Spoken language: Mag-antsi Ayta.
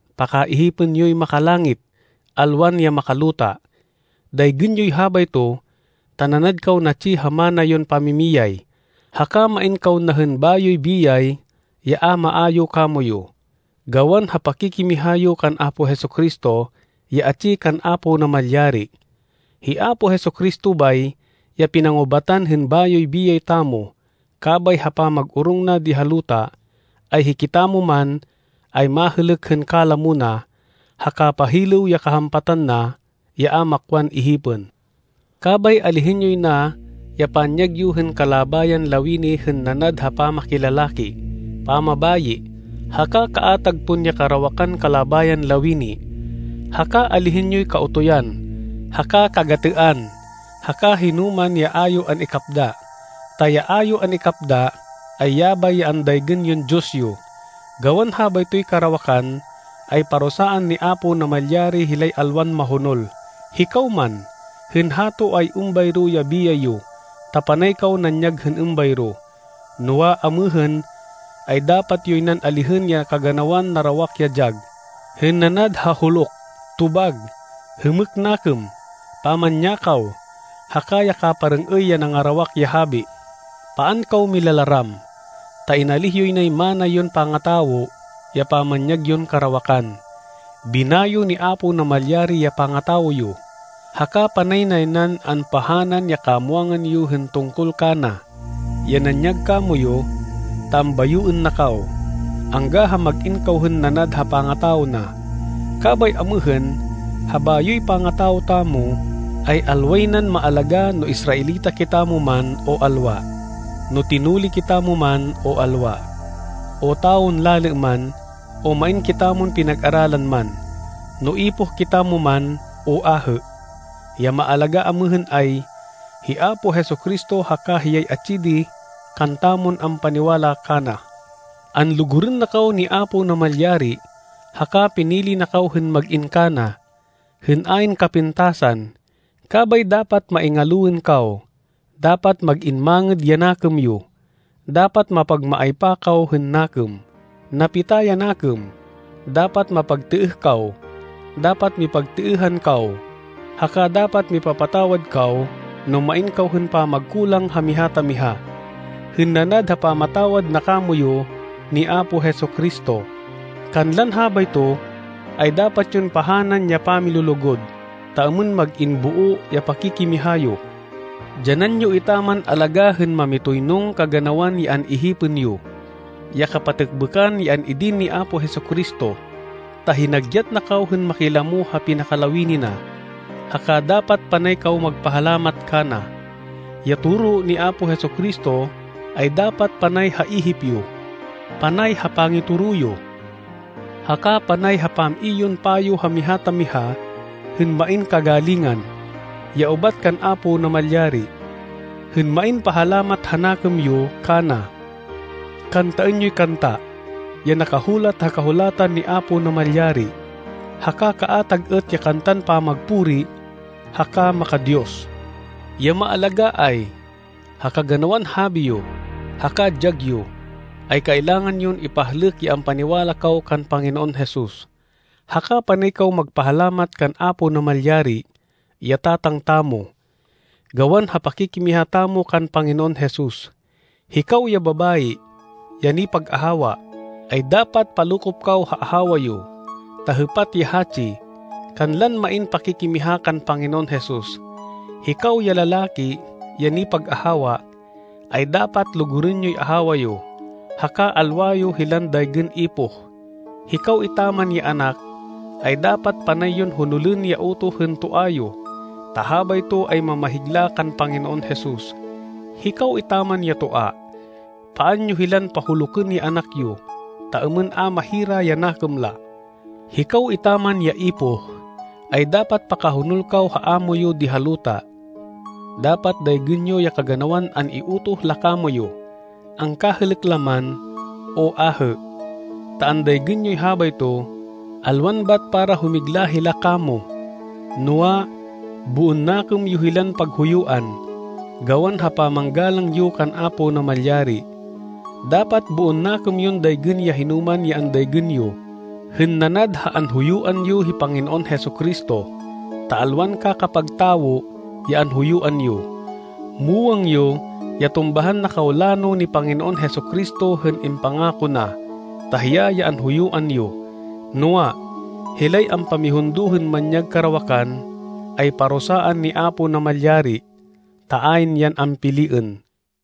Pakaihipên yoy makalangit, alwan ya makaluta. Daygên yoy habayto ta nanad kaw natsi ha mana yon pamimiyay, haka main kaw na hên bayoy biyay ya a maayu kamoyu, gawan ha pakikimiha yo kan Apo Jesu-Cristo, ya atsi kan Apo Namalyari. Hi Apo Jesu-Cristo bay, ya pinangubatan hên bayoy biyay tamo, kabay ha pamag-orong na di ha luta, ay hikitamo man, ay mahêlêk hên kalamo na, ha kapahilêw ya kahampatan na, ya a makwan ihipên. Kabay alihên yoy na ya panyag yo hên kalabayan lawini hên, nanad ha pamakilalaki, pamabayi, haka kaatag pon ya karawakan kalabayan lawini. Haka alihên yoy kaotoyan haka kagatêan, haka hinoman ya a yo an-ikapda, ta ya a yo an-ikapda, ay yabay ya andaygên yon diyos yo. Gawan habaytoy karawakan, ay parusaan ni Apo Namalyari hilay alwan mahonol. Hikaw man, hên hato, ay êmbayro ya biyay yo, ta panay kaw nanyag hên êmbayro. Noa, amêhên, ay dapat yoy nan alihên ya kaganawan narawak ya dyag, hên nanad ha huluk, tobag, hêmêk nakêm, pamanyakaw, haka ya kaparêng-êy ya nangarawak ya habi. Paan kaw milalaram, ta inalíh yoy nay mana yon pangatawo, ya pamanyag yon karawakan. Binayo ni Apo Namalyari ya pangatawo yo, haka panay nay nan ampahanan ya kamwangan yo hên tungkol kana, ya nanyag kamoyu, ta ambayoên na kaw, angga ha mag-in kaw hên nanad ha pangatawo na. Kabay amêhên, ha bayoy pangatawo tamo, ay alway nan maalagá no Israelita kitamo man, o alwa, no tinuli kitamo man, o alwa, o tawon lalê man, o main kitamon pinag-aralan man, no ipoh kitamo man, o ahê. Ya maalagá amêhên ay, hi Apo Jesu-Cristo haka hiyay atsi di kantamon ampaniwala kana. Anlugurên na kaw ni Apo Namalyari, haka pinili na kaw hên mag-in kana, hên ayn kapintasan. Kabay dapat maingaloên kaw, dapat mag-in mangêd ya nakêm yo, dapat mapagmaaypa kaw hên nakêm, napita ya nakêm, dapat mapagtêeh kaw. Dapat mipagtêêhan kaw, haka dapat mipapatawad kaw no main kaw hên pamagkulang ha miha ta miha, hên nanad ha pamatawad na kamoyu ni Apo Jesu-Cristo. Kanlan habayto ay dapat yon pahanan ya pamilulugud, ta êmên mag-in boo ya pakikimiha yo. Dyanan yo etaman alagá hên mamitoynong kaganawan ya an-ihipên yo, ya kapatêkbêkan ya an-idin ni Apo Jesu-Cristo, ta hinagyat na kaw hên makilamo ha pinakalawini na. Haka dapat panay kaw magpahalamat kana. Ya toro ni Apo Jesu-Cristo, ay dapat panay ha ihip yo, panay ha pangitoro yo, haka panay ha pam-i yon payo ha miha ta miha hên main kagalingan, ya ubat kan Apo Namalyari. Hên main pahalamat ha nakêm yo kana, kantaên yoy kanta, ya nakahulat ha Kahulatan ni Apo Namalyari, haka kaatag êt ya kantan pamagpuri, haka maka-Diyos. Ya maalagá ay, ha kaganawan habi yo, haka dyag yo, ay kailangan yon ipahlêk ya ampaniwala kaw kan Panginoon Jesus. Haka panay kaw magpahalamat kan Apo Namalyari, ya Tatang tamo, gawan ha pakikimiha tamo kan Panginoon Jesus. Hikaw ya babayi, ya nipag-ahawa, ay dapat palokop kaw ha ahawa yo, ta hêpat ya hatsi, kanlan main pakikimiha kan Panginoon Jesus. Hikaw ya lalaki, ya nipag-ahawa, ay dapat lugurên yoy ahawa yo, haka alwa yo hilan daygên ipoh. Hikaw etaman ya anak, ay dapat panay yon honolên ya utoh hên toa yo, ta habayto ay mamahigla kan Panginoon Jesus. Hikaw etaman ya toa, paan yo hilan pahulukên ya anak yo, ta êmên a mahira ya nakêm la. Hikaw etaman ya ipoh, ay dapat pakahonol kaw ha amo yo di ha luta. Dapat daygên yo ya kaganawan an-iutoh la kamoyu, angkahêlêk la man, o ahê, ta andaygên yoy habayto, alwan bat para humigla hila kamo, noa, boon nakêm yo hilan paghuyuan, gawan ha pamanggalang yo kan Apo Namalyari. Dapat boon nakêm yon daygên ya hinoman ya andaygên yo, hên nanad ha anhuyuan yo hi Panginoon Jesu-Cristo, ta alwan kakapag tawo ya anhuyuan yo. Muwang yo ya tumbahan na kaw lano ni Panginoon Jesu-Cristo hên impangako na, ta hiya ya anhuyuan yo. Noa, hilay ampamihundo hên manyag karawakan, ay parusaan ni Apo Namalyari, ta ayn yan ampiliên.